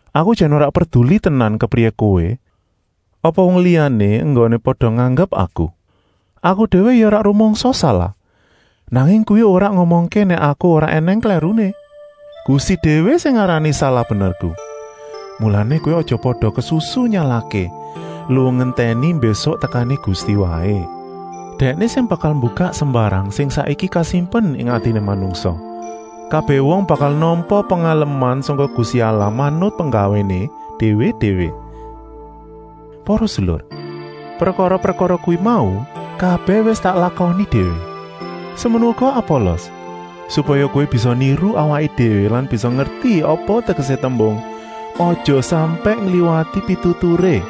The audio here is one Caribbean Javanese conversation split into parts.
Aku jan ora perduli tenan kepriyé kowé apa wong liyané enggoné pada nganggep aku. Aku déwé ya ora rumangsa salah, nanging kuwi ora ngomongké nèk aku ora ènèng klèruné. Gusti déwé sing ngarani salah-benerku. Mulané kowé aja pada kesusu nyalahké, luwung ngentèni mbésuk tekané Gusti waé. Dèkné sing bakal mbukak sembarang sing saiki kasimpen ing atiné manungsa. Kabèh wong bakal nampa pengaleman sangka Gusti Allah manut penggawéné déwé-déwé. Para sedulur, prekara-prekara kuwi mau kabèh wis tak lakoni déwé, semono uga Apolos, supaya kowé bisa niru awaké déwé lan bisa ngerti apa tegesé tembung: “Aja sampèk ngliwati pituturé.”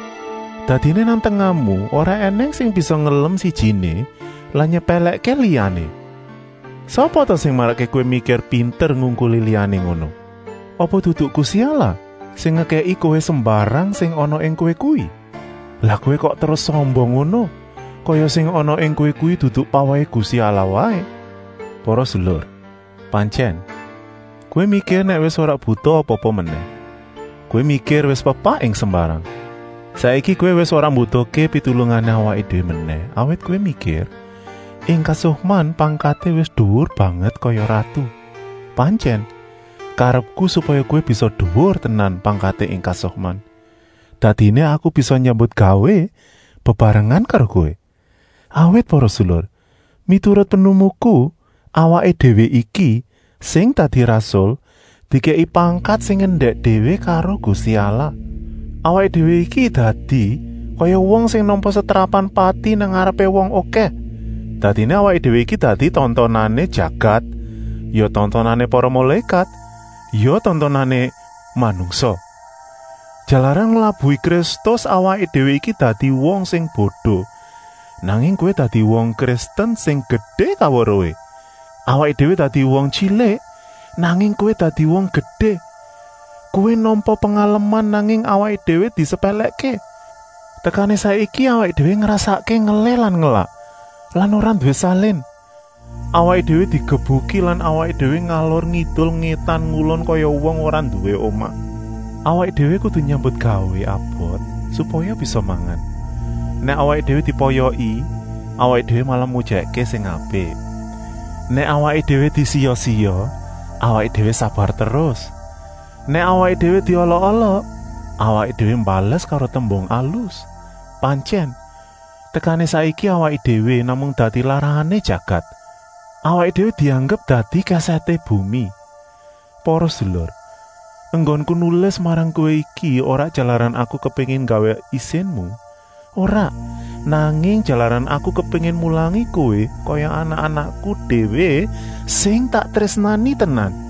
Dadiné nang tengahmu ora ènèng sing bisa ngelem sijiné lan nyepèlèkké liyané. Sapa ta sing marakké kowé mikir pinter ngungkuli liyané ngono? Apa dudu Gusti Allah sing ngekèki kowé sembarang sing ana ing kowé kuwi? Lah kowé kok terus sombong ngono, kaya sing ana ing kowé kuwi dudu pawèhé Gusti Allah waé. Para sedulur, pantyèn, kowé mikir nèk wis ora butuh apa-apa menèh, kowé mikir wis pepak ing sembarang. Saiki kowé wis ora mbutuhké pitulungané awaké déwé menèh, awit kowé mikir, ing kasukman pangkaté wis duwur banget kaya ratu. Pantyèn, karepku supaya kowé bisa duwur tenan pangkaté ing kasukman, dadiné aku bisa nyambutgawé bebarengan karo kowé. Awit para sedulur, miturut pinemuku, awaké déwé iki, sing dadi rasul, dikèki pangkat sing endèk déwé karo Gusti Allah. Awaké déwé iki dadi kaya wong sing nampa setrapan pati nang ngarepé wong okèh. Dadiné awaké déwé iki dadi tontonané jagat, ya tontonané para mulékat, ya tontonané manungsa. Jalaran nglabuhi Kristus awaké déwé iki dadi wong sing bodo, nanging kowé dadi wong Kristen sing gedé kaweruhé. Awaké déwé dadi wong tyilik, nanging kowé dadi wong gedé. Kowé nampa pengaleman, nanging awaké déwé disepèlèkké. Tekané saiki awaké déwé ngrasakké ngelih lan ngelak lan ora nduwé salin. Awaké déwé digebuki lan awaké déwé ngalor-ngidul-ngétan-ngulon kaya wong ora nduwé omah. Awaké déwé kudu nyambutgawé abot supaya bisa mangan. Nèk awaké déwé dipoyoki, awaké déwé malah mujèkké sing apik. Nèk awaké déwé disiya-siya, awaké déwé sabar terus. Nèk awaké déwé diolok-olok, awaké déwé mbales karo tembung alus. Pantyèn, tekané saiki awaké déwé namung dadi larahané jagat. Awaké déwé dianggep dadi kèsèté bumi. Para sedulur, enggonku nulis marang kowé iki ora jalaran aku kepéngin nggawé isinmu, ora, nanging jalaran aku kepéngin mulangi kowé kaya anak-anakku déwé sing tak trésnani tenan.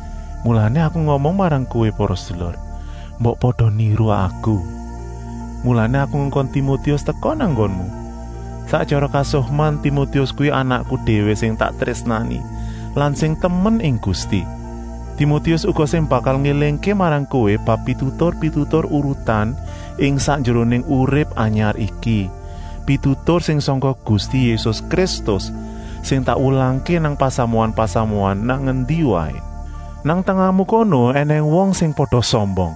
Mulané aku ngomong marang kowé para sedulur: mbok pada niru aku. Mulané aku ngongkon Timotius teka nang nggonmu. Sak tyara kasukman Timotius kuwi anakku déwé sing tak trésnani lan sing temen ing Gusti. Timotius uga sing bakal ngélingké marang kowé bab pitutur-pitutur urutan ing sakjeroné urip anyar iki, pitutur sing sangka Gusti Yésus Kristus, sing tak wulangké nang pasamuan-pasamuan nang endi waé. Nang tengahmu kono ènèng wong sing pada sombong,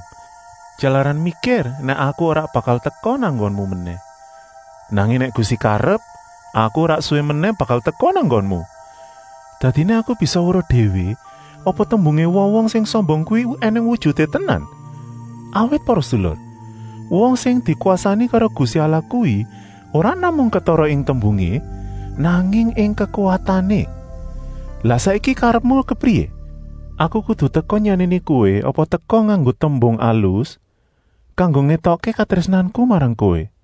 jalaran mikir nèk aku ora bakal teka nang nggonmu menèh. Nanging nèk Gusti karep, aku ora suwi menèh bakal teka nang nggonmu. Dadiné aku bisa weruh déwé, apa tembungé wong-wong sing sombong kuwi ènèng wujuté tenan. Awit para sedulur, wong sing dikwasani karo Gusti Allah kuwi ora namung ketara ing tembungé, nanging ing kekuwatané. Lah saiki karepmu kepriyé? Aku kudu teka nyenèni kowé apa teka nganggo tembung alus kanggo ngétokké katrésnanku marang kowé.